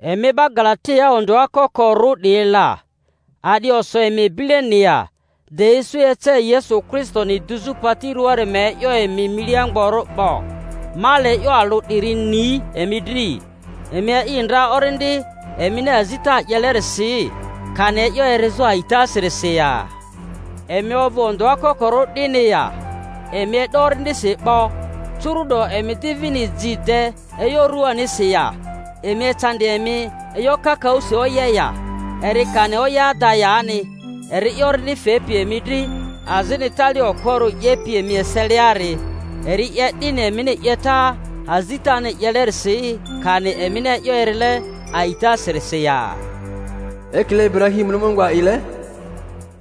Emi 'ba Galatiaa ondᴜa kokorᴜ 'diyi la! A'di oso emi bileni ya, de isu ece Yesu Kristoni dizᴜ pati rᴜaari ma e'yo emi milia mgborᴜ 'bo? Ma le e'yo alᴜ 'diri ni emi dri: Emi a'i ndra Orindi emini azita 'yelerisi kani e'yo erizᴜ a'itasirisi ya? Emi ovᴜ ondᴜa kokorᴜ 'dini ya? Emi e'do Orindisi 'bo, curu'do emi di vini ji de e'yo ruanisi ya? Emi ecandi emi e'yo kakaᴜsi oye ya?—eri kani oye ada yani. Eri'i Orindi fepi emi dri azini tali okporᴜ 'yepi emi eseliari, eri 'ye 'dini emini 'yeta azitani 'yelerisi kani emini e'yo erile a'itasirisi ya? Ekile Iburahimuni Mungu a'ile,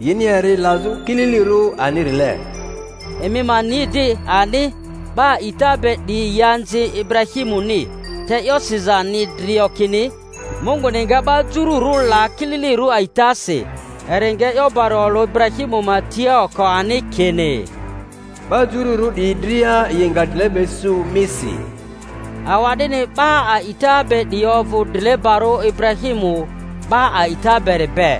yini eri lazᴜ kililirᴜ anirile. Emi ma ni di ani,'ba a'ita be 'diyi yi anzi Iburahimuni. Te e'yo siza ni drio kini Munguni nga 'ba jururᴜ la kililirᴜ a'itasi, eri nga e'yo bari olᴜ Iburahimu ma tia oko ani kini, 'Ba jururᴜ 'diyi dria yi nga drileba isu misi. Awa'dini 'ba a'ita be 'diyi ovᴜ drilebarᴜ Iburahimu 'ba a'ita beri be.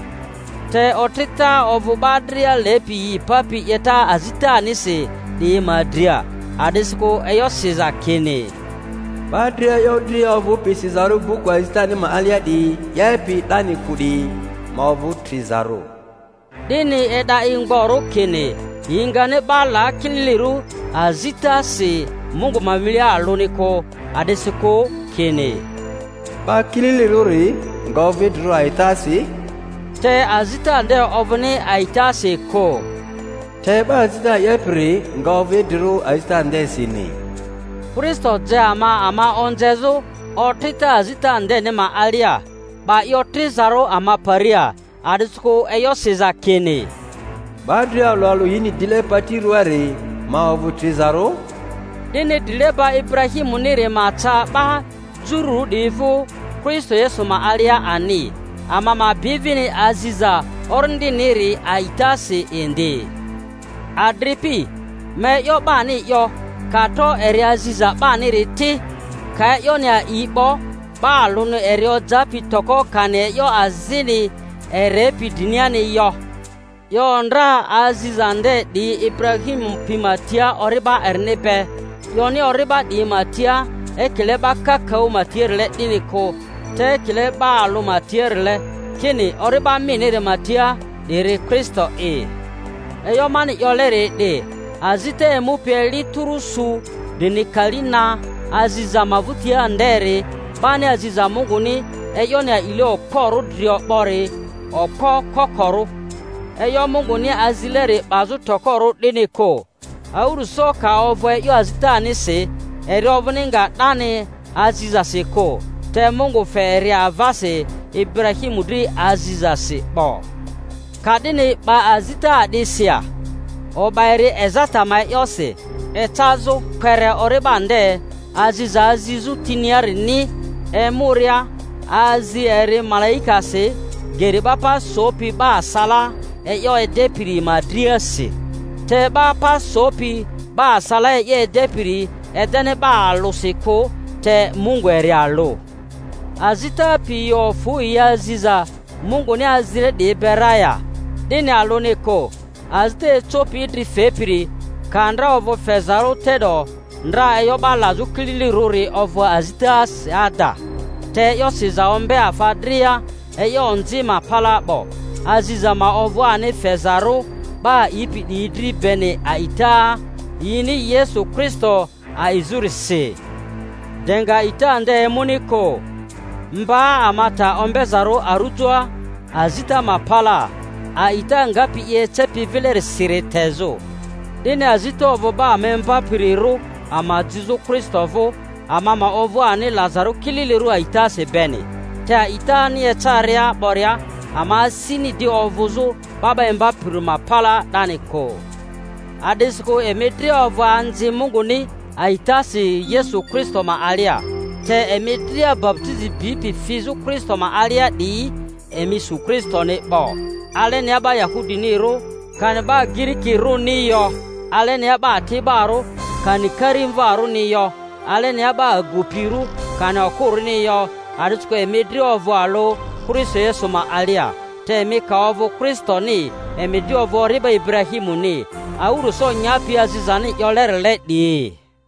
Te otrita ovᴜ 'ba dria lepi yi papi 'yeta azitanisi 'diyi ma dria, a'disikᴜ e'yo siza kini, 'Ba dria e'yo dria ovᴜpi sizarᴜ buku azitani ma alia 'diyi 'yepi 'dani kᴜ 'diyi ma ovᴜ trizarᴜ. 'Dini e'da i mgborᴜ kini yi ngani 'ba la kililirᴜ azitasi Mungu ma milia alᴜni kᴜ; a'disikᴜ kini, 'Ba kililirᴜri nga ovᴜ idrirᴜ a'itasi; te azita nde ovᴜni a'itasi kᴜ, te 'Ba azita 'yepiri nga ovᴜ idrirᴜ azita ndesini. Kristo je ama ama onzezᴜ otrita azita ndeni ma alia, 'ba i otrizarᴜ ama paria—a'disikᴜ e'yo siza kini, 'Ba dria alᴜ alᴜ yini dile pati rᴜaari ma ovᴜ trizarᴜ— 'dini drileba Iburahimuniri ma ca 'ba Jururᴜ 'diyi vᴜ Kristo Yesu ma alia ani, ama ma bi vini aziza Orindiniri a'itasi indi. Adripi, ma e'yo 'bani 'yo: ka tro eri aziza 'baniri ti, ka e'yoni a'i 'bo, 'ba alᴜni eri ojapi toko kani e'yo azini erepi driniani yo. 'Yo ndra aziza nde 'diyi Iburahimu pi ma tia ori'ba erini be. 'Yoni, Ori'ba 'diyi ma tia, ekile 'ba kakaᴜ ma tiarile 'dini kᴜ; te ekile 'ba alᴜ ma tiarile, kini, Ori'ba miniri ma tia, 'diri Kristo'i. E'yo mani 'yoleri 'di: azita emupi eli tᴜrᴜ su drini kali na aziza ma vᴜtia nderi 'bani aziza Munguni e'yoni a'ile okporᴜ drio 'bori okpo kokorᴜ, e'yo Munguni azileri 'bazᴜ tokorᴜ, 'dini kᴜ. Awᴜrᴜso ka ovᴜ e'yo azitanisi, eri ovᴜni nga 'dani azizasi kᴜ; te Mungu fe eri avasi Iburahimu dri azizasi 'bo. Ka'dini 'ba azita a'disi ya? O'ba eri ezata ma e'yosi ecazᴜ kpere ori'ba nde aziza azizᴜ tiniarini emuria; azi eri malaikasi geri 'ba pa sopi 'ba asalaa e'yo edepiri ma driasi. Te 'ba pa sopi 'ba asalaa e'yo edepiri edeni 'ba alᴜsi kᴜ; te Mungu eri alᴜ. Azita pi yi ofu yi aziza Munguni azile 'diyi be ra ya? 'Dini alᴜni kᴜ; azita ecopi idri fepiri ka ndra ovᴜ fezarᴜ, te'do ndra e'yo 'ba lazᴜ kililirᴜri ovᴜ azitasi ada. Te e'yo siza ombe afa dria e'yo onzi ma palaa 'bo, aziza ma ovᴜ ani fezarᴜ 'ba a'ipi 'diyi dri beni a'ita yini Yesu Kristo a'izᴜrisi. De nga a'ita nde emuni kᴜ, mba ama ta ombezarᴜ arujoa azita ma palaa, a'ita ngapi i ecepi vilerisiri tezᴜ. 'Dini azita ovᴜ 'ba ama imbapirirᴜ ama jizᴜ Kristo vᴜ, ama ma ovᴜ ani lazarᴜ kililirᴜ a'itasi beni. Te a'itani ecaria 'boria ama asini di ovᴜzᴜ 'ba 'ba imbapiri ma palaa 'dani kᴜ; a'disikᴜ emi dria ovᴜ anzi Munguni a'itasi Yesu Kristo ma alia. Te emi dria baputizi bipi fizᴜ Kristo ma alia 'diyi emi su Kristoni 'bo. Alenia 'ba Yahudinirᴜ kani 'ba Girikirᴜni yo, alenia 'ba ati'borᴜ kani karimvarᴜni yo, alenia 'ba agupirᴜ kani okᴜrᴜni yo; a'disikᴜ emi dria ovᴜ alᴜ Kristo Yesu ma alia. Te emi ka ovᴜ Kristoni, emi di ovᴜ ori'ba Iburahimuni, awᴜrᴜso nyapi azizani 'yolerile 'diyi.